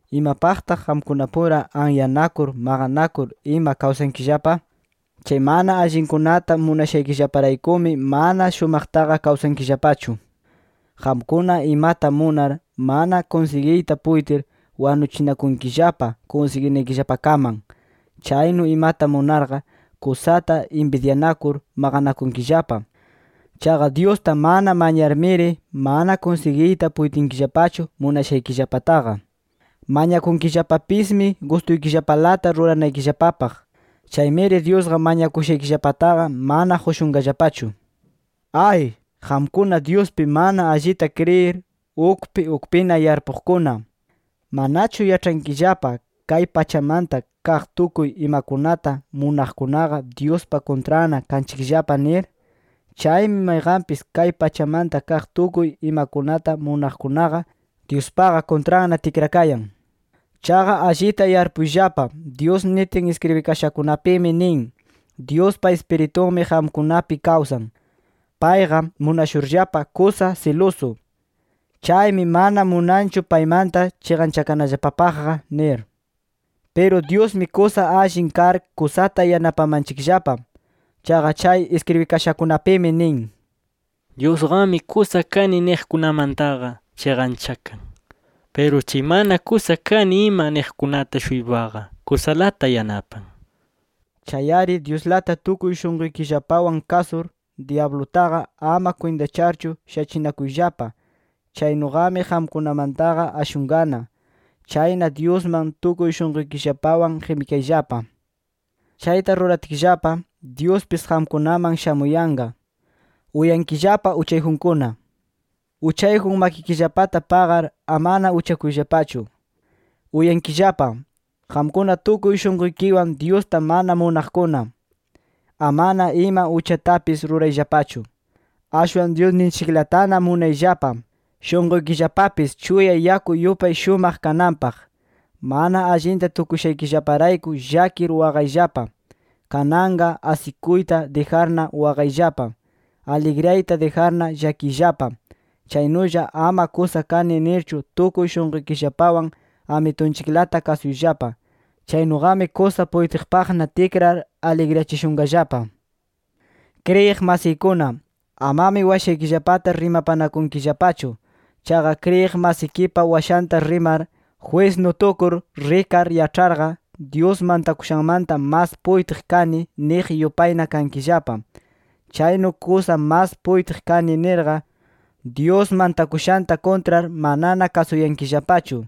¿Imapaqtaq qamkunapura anyanakur, maqanakur ima kawsankillapa? Chay mana allinkunata munashaykillaparaykumi, mana shumaqtaqa kawsankillapachu. Qamkuna imata munar, mana kunsigiyta puytir, wanuchikunkillapa kunsiginaykillapakaman. Chaynu imata munarqa, kusata inbidyanakur, maqanakunkillapa. Chaqa Dyusta mana mañarmiri, mana kunsigiyta puytinkillapachu munashaykillapataqa. Mañakunkillapapismi gustuykillapalata ruranaykillapapaq. Chaymiri Dyusqa mañakushaykillapataqa mana qushunllapachu. ¡Ay, qamkuna Dyuspi mana allita kriyir, ukpi ukpina yarpuqkuna! ¿Manachu yaĉhankillapa kay pachamanta kaq tukuy imakunata munaqkunaqa Dyuspa kuntranna kanchikllapa nir? Chaymi mayqanpis kay pachamanta kaq tukuy imakunata munaqkunaqa, Dyuspaqa kuntranna tikrakayan. Chaqa allita yarpuyllapa, Dyus nitin iskribikashakunapimi nin: “Dyuspa Ispiritunmi qamkunapi kawsan. Payqa, munashurllapa kusa silusu. Chaymi mana munanchu paymanta chiqanchakanallapapaqqa” nir. Piru Dyusmi kusa allin kar kusata yanapamanchikllapa. Chaqa chay iskribikashakunapimi nin: “Dyusqami kusa kani niqkunamantaqa chiqanchakan. Piru chay mana kusa kani ima niqkunata-shuypaqa kusalata yanapan” nir. Chay-ari Dyuslata tukuy shunquykillapawan kasur, dyablutaqa ama kwintacharchu shachinakuyllapa. Chaynuqami qamkunamantaqa ashunqana. Chayna Dyusman tukuy shunquykillapawan qimikayllapa. Chayta ruratkillapa, Dyuspis qamkunaman shamuyanqa. Uyankillapa uchayjunkuna: Uchayjun makikillapata paqar, amana uchakuyllapachu. Uyankillapa, qamkuna tukuy shunquykiwan Dyusta mana munaqkuna: Amana ima uchatapis rurayllapachu. Ashwan Dyusninchiklatana munayllapa, shunquykillapapis chuya yaku yupay shumaq kananpaq. Mana allinta tukushaykillaparayku llakir, waqayllapa. Kananqa asikuyta dijarna, waqayllapa. Aligriyayta dijarna, llakiyllapa. Chaynulla ama kusa kani nirchu tukuy shunquykillapawan Amitunchiklata kasuyllapa. Chaynuqami kusa puytiqpaqna tikrar, aligriyachishunqallapa. Kriyiq masiykuna, amami washaykillapata rimapanakunkillapachu. Chaqa kriyiq masikipa washanta rimar, jwisnu tukur rikar yaĉharqa “Dyus mantakushanmanta mas puytiq kani” niq yupayna kankillapa. Chaynu kusa mas puytiq kani nirqa, Dyus mantakushanta kuntrar manana kasuyankillapachu.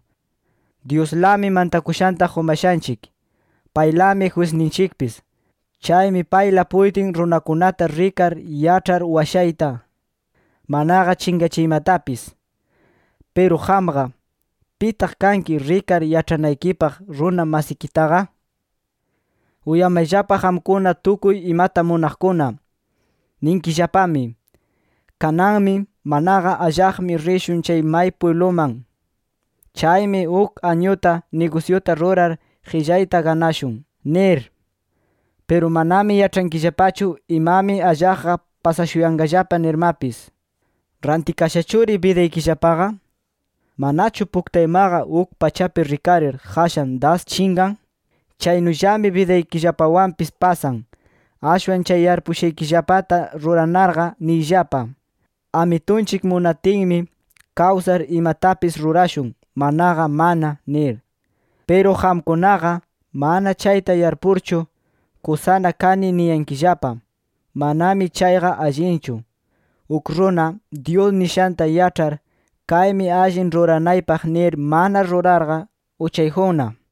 Dyuslami mantakushanta qumashanchik. Paylami jwisninchikpis. Chaymi payla puytin runakunata rikar yaĉhar washayta, manaqa chinqachiymatapis. Piru qamqa, ¿pitaq kanki rikar yaĉhanaykipaq runa masikitaqa? Uyamayllapa qamkuna, tukuy imata munaqkuna. Ninkillapami: “Kananmi, manaqa allaqmi rishun chay may pwibluman. Chaymi uk añuta nigusyuta rurar, qillayta ganashun” nir. Piru manami yaĉhankillapachu imami allaqqa pasashuyanqallapa nirmapis. ¿Rantikashachuri bidaykillapaqa? ¿Manachu puktaymaqa uk pachapi rikarir, qashan das chinqan? Chaynullami bidaykillapawanpis pasan. Ashwan chay yarpuyashaykillapata ruranarqa, niyllapa: “Amitunchik munatinmi, kawsar imatapis rurashun, manaqa mana” nir. Piru qamkunaqa, mana chayta yarpurchu, kusana kani niyankillapa. Manami chayqa allinchu. Uk runa, Dyus nishanta yaĉhar, kaymi allin ruranaypaq nir mana rurarqa, uchayjunna.